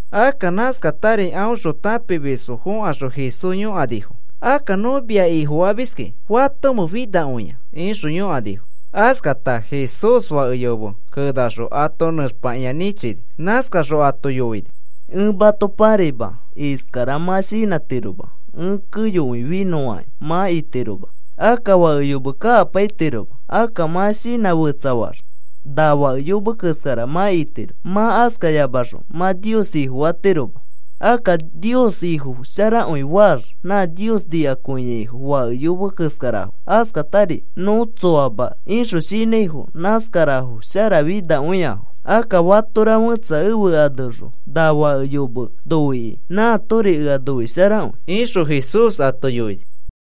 Akka nãskatari aõxõ tãpimisfo fõkaxõ Jesús yõkanifo: “Akka, nõ mia Ifofamiski, ¿fatomẽ finakõia?” ixõ yõkanifo. Askata Jesús fake yome kenaxõ ato nẽxpakĩa nĩchini. Nãskaxõ ato yoini: “Ẽ mato pãraima. Iskara mã shinãtiroma: ‘Ẽ keyokõi finõfakĩ,’ mã itiroma. Akka fake yome kakapaitiroma. Akka mã shinã fetsafaax na fake yome keskara mã itiro. Mã askayamaxõ mã Nios Ifofatiroma. Akka Nios Ifo sharakõi faax nã Nios nikakõiaifo fake yome keskarafo, askatari, ‘Nõ tsoama,’ ixõ shinãifo nãskarafo sharafinakõiafo. Akka fatora fẽtsa ẽfe aneõxõ na fake yome noikĩ nãatori ea noisharakõi,” ixõ Jesús ato yoini.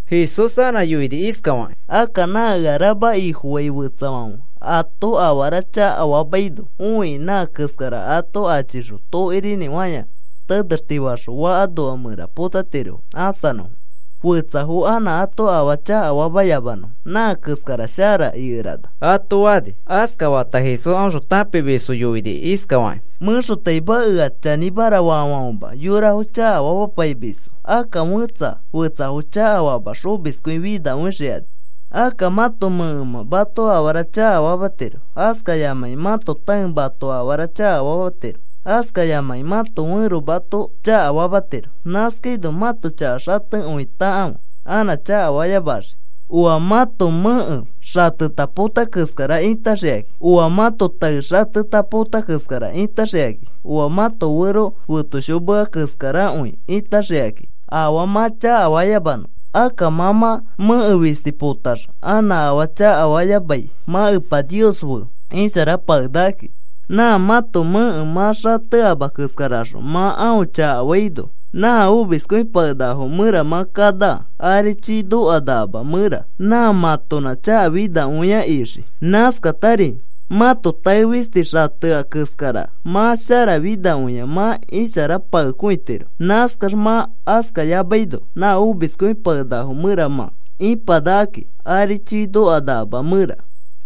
Jesús anã yoini iskafakĩ: “Akka nã ea rama Ifofai fetsafãfe ato afara chakafamaino õikĩ, nã keskarafo ato achixõ tokirinĩfãya tenextifaxõ fakafã noa mẽra potatirofo ãsanõfo fetsafo anã ato afaa chakafamayamanõfo. Nã keskara shara ikerana,” ato fani. Askafata Jesús aõxõ tãpimisfo yoini iskafakĩ: “Mẽxotaima ea chanĩmara faafãfema yorafo chakafamapaimisfo. Akka fẽtsa fetsafo chakafamax omiskõi finakõixikani. “Akka mãto mẽkemã mato afara chakafamatiro, askayamãkĩ mãto tãe mato afara chakafamatiro, askayamãkĩ mãto fẽro mato chakafamatiro. Nãskaino mãto chaka xatekõitakãfe anã chakafayamaxii. Oa mãto mẽke xateta pota keskara itaxikakĩ, oa mãto tae xateta pota keskara itaxikakĩ, oa mãto fero fetoshimea keskarakõi itaxikakĩ afaa mã chakafayamanõ. Akka mã mã mẽke fisti potax anã afaa chakafayamai mã Epa Nios fe isharapakenakaki. Nã keskara sharakõi. Nã mãto mẽke mã xateama keskaraxõ mã aõ chakafaino, nã omiskõipakenakafo mẽra mã kanaka ari chiifã nokanakama mẽra. Nã mãtonã chaka finakõia ixii. Nãskatari mãto tae fisti xatea keskara mã sharafinakõia mã isharapakekõitiro. Nãskax, mã askayamaino nã omiskõipakenakafo mẽra mã ipanakaki ari chiifã nokanakama mẽra.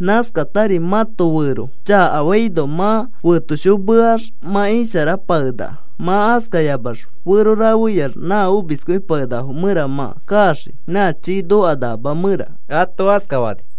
Nãskatari mãto fẽro chakafaino, mã fetoshimeax mã isharapakenakaki. Mã askayamax fero rafeyax nã omiskõipakenakafo mẽra mã kaxii nã chiifã nokanakama mẽra,” ato askafani.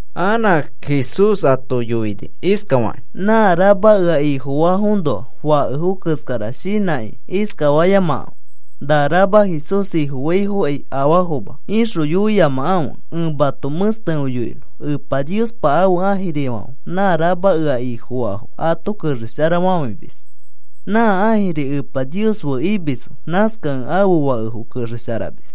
Anã Jesús ato yoini iskafakĩ: “Nã rama ea Ifofaõnoa fakefo keskara shinãkĩ iskafayamakãfe: ‘Na rama Jesús Ifofaafokai afaafoma,’ ixõ yoiyamakãfe. Ẽ mato mẽstekõi yoinõ. Epa Niospa ãfe ãjirifãfe nã rama ea Ifofaafo ato kexesharafafãimis. Nã ãjirifo Epa Nios fe imisfo. Nãskakẽ ãfe fakefo kexesharamis.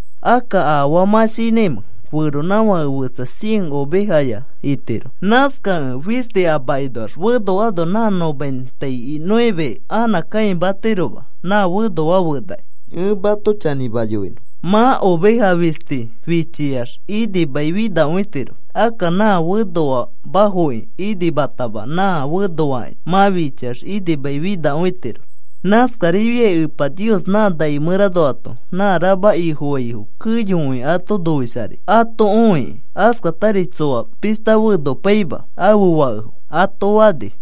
“Akka, ¿afaa mã shinãimẽ? Feronãfake fetsa cien ovejaya itiro. Nãskakẽ fisti a makinoax fenoano nã noventa y nueve anã kãimatiroma nã fenoa fenakĩ. Ẽ mato chanĩma yoinõ. Mã oveja fisti fichiax inimaifinakõitiro. Akka nã fenoamafoki inimatama nã fenoitaki mã fichiax inimaifinakõitiro. Nãskarifiai Epa Nios nã nai mẽranoato nã rama Ifofaifo keyokõi ato noisharai ato õikĩ. Askatari tsoa pishta fenopaima ãfe fakefo,” ato fani.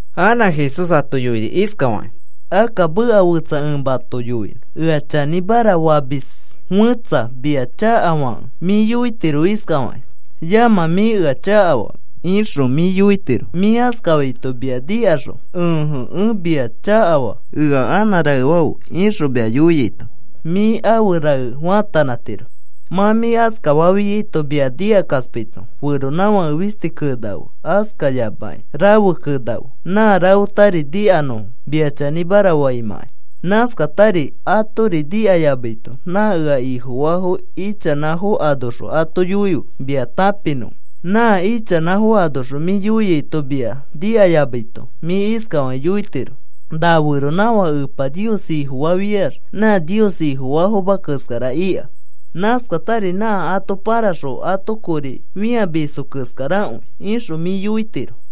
Anã Jesús ato yoini iskafakĩ: “Akka meka fetsa ẽ mato yoinõ. Ea chanĩmara famis fẽtsa mia chakafakẽ mĩ yoitiro iskafakĩ: ‘Yamã, mĩ ea chakafaa,’ ixõ mĩ yoitiro. Mĩ askafaito mia nikaxõ, ‘Ẽje. Ea mĩa chakafa. Ea anã raefafe,’ ixõ mia yoiaito mĩ afe rae faatanãtiro. Nã mĩ askafafiaito mia nikakaspaito feronãfake fisti kenafe, askayamakĩ rafe kenafe nã rafetari nikanõfo mia chanĩmara faimãkai. Nãskatari atori nikayamaito nã ea Ifofaafo ichanãfo anoxõ ato yoife mia tãpinõfo. Nã ichanãfo anoxõ mĩ yoiaito mia nikayamaito mĩ iskafakĩ yoitiro: ‘Na feronãfãke Epa Nios Ifofafiax nã Nios Ifofaafoma keskara ika. Nãskatari nã ato pãraxõ ato kori fĩamisfo keskarakõi,’ ixõ mĩ yoitiro.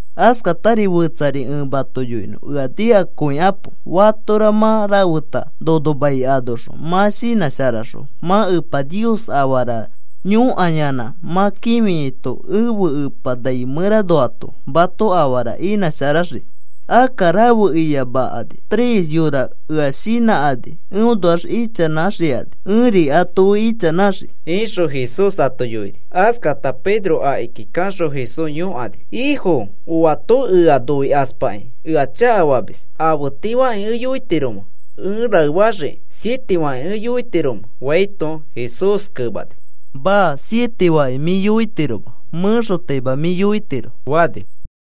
“Askatari fetsari ẽ mato yoinõ, ea nikakõikapo. Fatora mã rafeta nono mai anoxõ mã shinãsharaxõ, mã Epa Nios afara yõkaiyanã mã kĩfiaito ẽfe Epa nai mẽranoato mato afara inãsharaxii. Akka rafe iyamakani tres yora ea shinãkani eõnoax ichanãkaxikani ẽri ato fe ichanãxii,” ixõ Jesús ato yoini. Askata Pedro akiki kaxõ Jesús yõkani: “¿Ifo, oato ea noikaspakĩ ea chakafamis, afe tii fakĩ ẽ yoitiromẽ ẽ raefaxiki? ¿Siete fakĩ ẽ yoitiromẽ?” faito, Jesús kemani: “Maa. Siete fakĩ mĩ yoitiroma. Mẽxotaima mĩ yoitiro,” fani.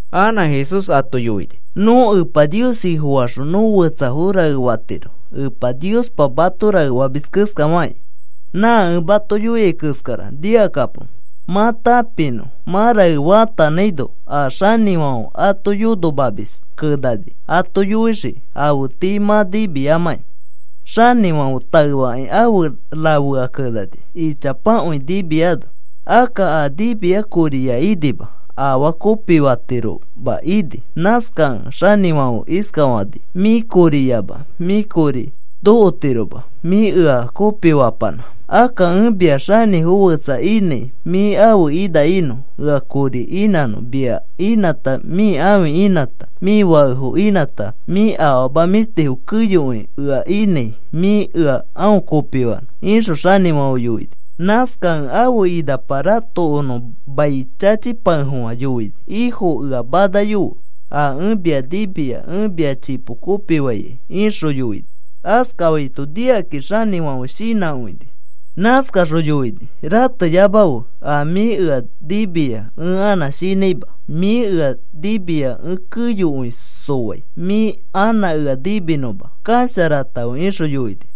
Anã Jesús ato yoini: “Nõ Epa Nios Ifofaxõ nõ fetsafo raefatiro, Epa Niospa mato raefamis keskafakĩ. Nã ẽ mato yoiai keskara nikakapo mã tãpinõ mã rae faatanãino. A xanĩfãfe ato yonomamis kenani ato yoixii afe tii mã nimiamakĩ. Xanĩfãfe taefakĩ afe rafea kenani ichapakõi nimiano. Akka a nimia koriya inima afaa kopifatiroma ini. Nãskakẽ xanĩfãfe iskafani: ‘Mĩ koriyama mĩ kori nokotiroma mĩ ea kopifapanã. Akka ẽ mia xanĩfo fetsa inãi mĩ ãfe ina inõ ea kori inãnõ. Mia inãta mĩ ãfi inãta mĩ fakefo inãta mĩ afama mĩshtifo keyokõi ea inãi mĩ ea aõ kopifanõ,’ ixõ xanĩfãfe yoini. Nãskakẽ ãfe inapa ratokonõ mai chachipakefofã yoini: ‘Ifo, ea manayofe. A ẽ mia nimia ẽ mia chipo kopifaikai,’ ixõ yoini. “Askafaito nikakĩ xanĩfãfe shinãkõini. Nãskaxõ yoini: ‘Rateyamafe. A mĩ ea nimia ẽ anã shinãima. Mĩ ea nimia ẽ keyokõi sofai mĩ anã ea niminõma. Kasharatãfe,’ ixõ yoini.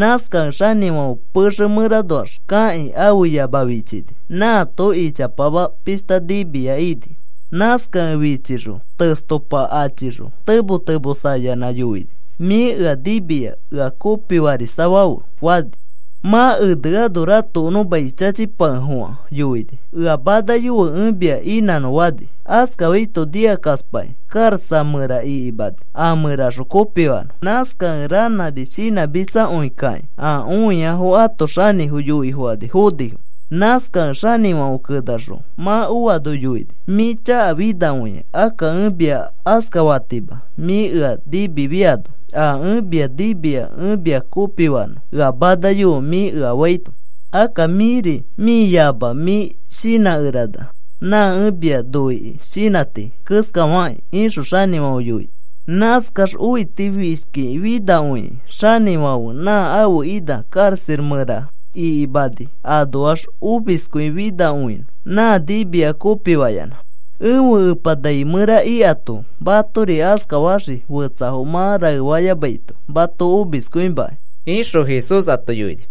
Nãskakẽ xanĩfãfe pexe mẽranoax kakĩ, ãfe yama fichini, nãato ichapama pishta nimia ini. Nãskakẽ fichixõ testopa achixõ temo temosayanã yoini: ‘Mĩ ea nimia ea kopifarisafãfe,’ fani. Mã eneano ratokonõ mai chachipafofã yoini, ‘Ea manayofe ẽ mia inãnõ,’ fani. Askafaito nikakaspakĩ karaxa mẽra ikimani a mẽraxõ kopifanõ. Nãskakẽ ranãri shinãmitsakõikakĩ a õiaifo ãto xanĩfo yoifokani fonifo. Nãskakẽ xanĩfãfe kenaxõ mã oano yoini: ‘Mĩ chaka finakõia. Akka ẽ mia askafatima mĩ ea nimifiano, “A ẽ mia nimia ẽ mia kopifanõ ea manayofe,” mĩ ea faito, akka mĩri mĩ yama mĩ shinãkerana nã ẽ mia noikĩ shinãti keskafakĩ,’ ixõ xanĩfãfe yoini. Nãskax õitifishki finakõikĩ xanifãfe nã ãfe ina karaxa mẽra ikimani anoax omiskõi finakõinõ nã nimia kopifayanã. “Ẽfe Epa nai ari ikato matori askafaxii fetsafo mã raefayamaito mato omiskõimaki,” ixõ Jesús ato yoini.